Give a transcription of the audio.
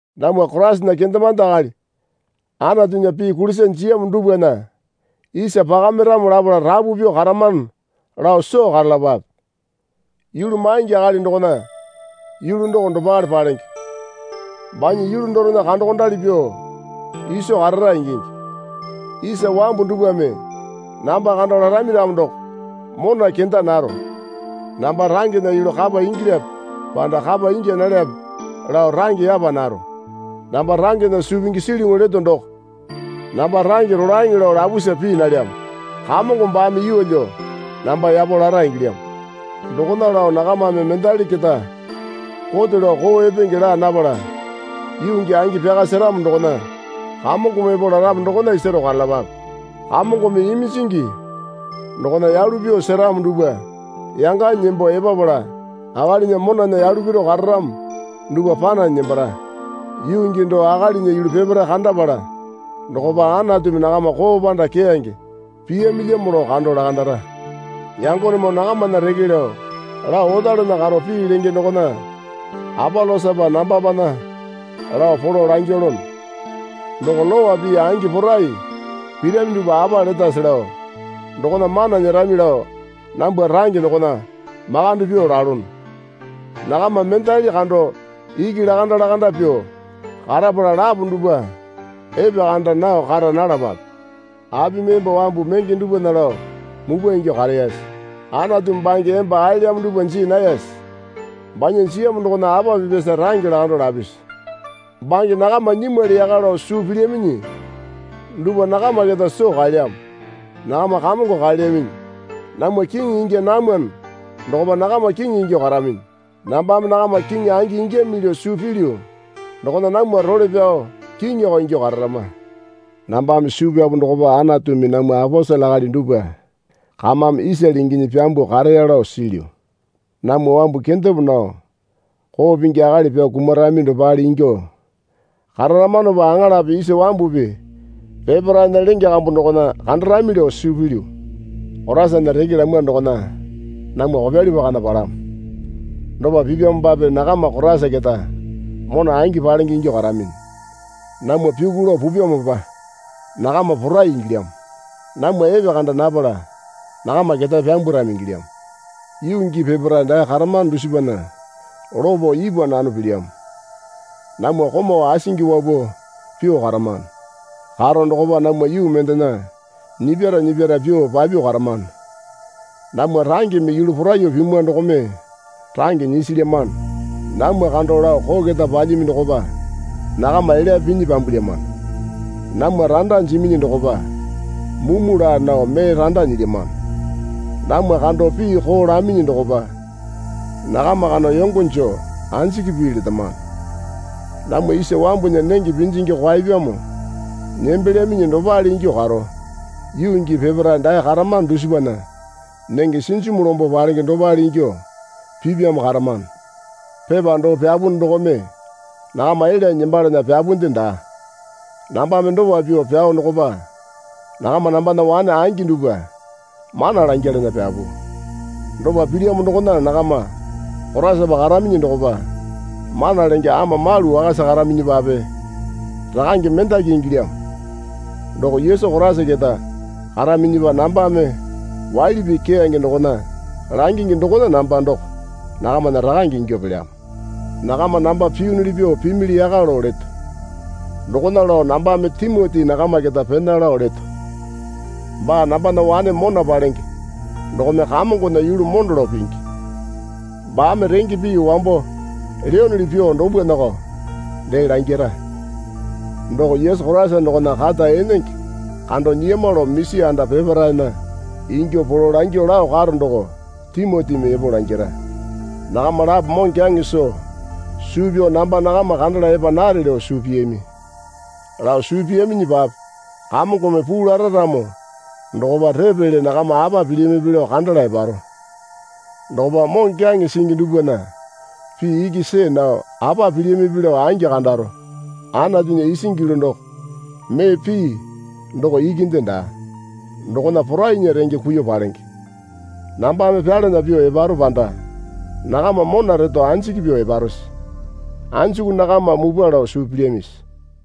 Namwa Koraisana kendemande akali Anatunya pii kulisa jiyamo dupwana isa pakamiramo lapala rapu pyuo karamano lao soo karalapape. Yulu maingi akali dokona yulu doko dopale palenge. Banya yulu dorena kandokondali pyuo iso karara ingingi. Isa wambu dupwame namba kando larami ramo doko mona kenda naro. Namba rangena yulu kapa ingilyape panda kapa ingya nalyape lao range yapa naro. Namba rangena suu pingi silyuŋu leto doko namba range rolaeŋe lao lapusa pii nalyamo. Kamongo baame yeelyo namba yapo lara ingilyamo. Dokona lao nakamame mendali keta kote lao koo epenge laa napala yuu gii angi pyaka seramo dokona Kamongome epo laramo dokona isaro karalapape. Kamongome iminjingi dokona yalu pyuo seramo duwpa yanganyi nembo epapala akalinya monana yalu piru kararamo dupwa pananyi nembara. Yuu gii doo akalinya yulu peparae kandapala dokopa Anatumi nakama koo panda keyange piyamilyamo lao kando lakandara. Yangonemoo nakamana reke lao lao otalana karo pii lenge dokona Apolosapa nambapana lao polo langilono. Doko lowa pii angi porai pirami dupwa apa letase lao dokona mana nyerami lao nambwa range dokona makande pyuo lalono. Nakama mendali kando iki lakanda lakanda pyuo karapala lapo dupwa epekanda nao kara nalapape. Apimi emba wambu menge dupwana lao mupwa ingyuo kareyase? Anatumi bange emba aelyamo dupwa jii nayase? Banya jiyamo dokona apa pipyamosa range lakando lapisi? Bange nakama nyimwali yaka lao suu pilyaminyi dupwa nakama keta soo kaelyamo. Nakama kamongo kaelyaminyi. Namwa kiŋi ingya namwano dokopa nakama kiŋi ingyuo karaminyi. Nambame nakama kiŋi angi ingyamili lao suu pilyu dokona namwa role pyao kiŋiyoko ingyuo kararama. Nambame suu pyapu dokopa Anatumi namwa aposele akali dupwa kamame isale inginyi pyambuo kareya lao silyu. Namwa wambu kendepo nao koo pingi akali pyao kumarami dopale ingyuo kararamanopa aŋalape isa wambupi peparaena lenge kambu dokona kandarami lao suu pilyu. Koraisana reke lamwa dokona namwa kopyali pakana palamo. Dopa pipyamopape nakama Koraisa keta mona angi palenge ingyuo karaminyi. Namwa pyuku lao pupyamopa nakama porai ingilyamo. Namwa epekanda napala nakama ketae pyambwarami ingilyamo. Yuu gii peparae dae karamano dusipana lopo ipwa nano pilyamo. Namwa komau asingi wapuo pyuo karamano. Karo dokopa namwa yuu mendena nyipyara nyipyara pyuo papyuo karamano. Namwa rangeme yuu poraiyuo pimwa dokome range nyisilyamano. Namwa kando lao koo keta palyami dokopa nakama elyape pinyi pyambwalyamano. Namwa randa jiminyi dokopa mumu laa nao mee randa nyilyamano. Namwa kando pii koo laminyi dokopa nakama kando yongo joo anjiki pii letamano. Namwa isa wambunya nenge pinjingi kwaepyamo nembelyaminyi dopale ingyuo karo yuu gii peparae dae karamano dusipana nenge sinjimu lombo palenge dopale ingyuo pipyamo karamano. Pepa doo pyapunu dokome nakama elyanyi nembalana pyapunde daa. Nambame dopa pyuo pyao dokopa nakama nambana wane angi dupwa mana langyalana pyapu. Dopa pilyamo dokona nakama Koraisapa karaminyi dokopa mana lenge ama malu wakasa karaminyipape rakane mendaki ingilyamo. Doko Yesu Koraisa keta karaminyipa nambame waili pii keyange dokona langingi dokona namba doko nakamana rakange ingyuo pelyamo. Nakama namba piyunuli pyuo pimili yaka lao leto. Dokona lao nambame Timoti nakama keta pena lao leto. Baa nambana wane mona palenge dokome Kamongona yulu mondo lao pingi. Baame renge pii wambo leyonoli pyuo dupwanako dee langira. Doko Yesu Koraisa dokona kata enenge kando nyiyama lao misi anda peparaena ingyuo polo langyuo lao karo doko Timotimi epo langira. Nakama lapo moŋokyaŋe soo suu pyao namba nakama kandala epa nare lao suu piyami. Lao suu piyaminyipape Kamongome puu lara ramo dokopa repele nakama apa pilyamipi lao kandala eparo. Dokopa moŋokyaŋe singi dupwana pii iki see nao apa pilyamipi lao angi kandaro. Anatunya isingi yulu doko mee pii doko ikinde daa. Dokona porainya renge kuiyuo palenge. Nambame pyalana pyuo eparo panda nakama mona reto anjiki pyuo eparose? Anjuku nakama mupwa lao suu pilyamisi?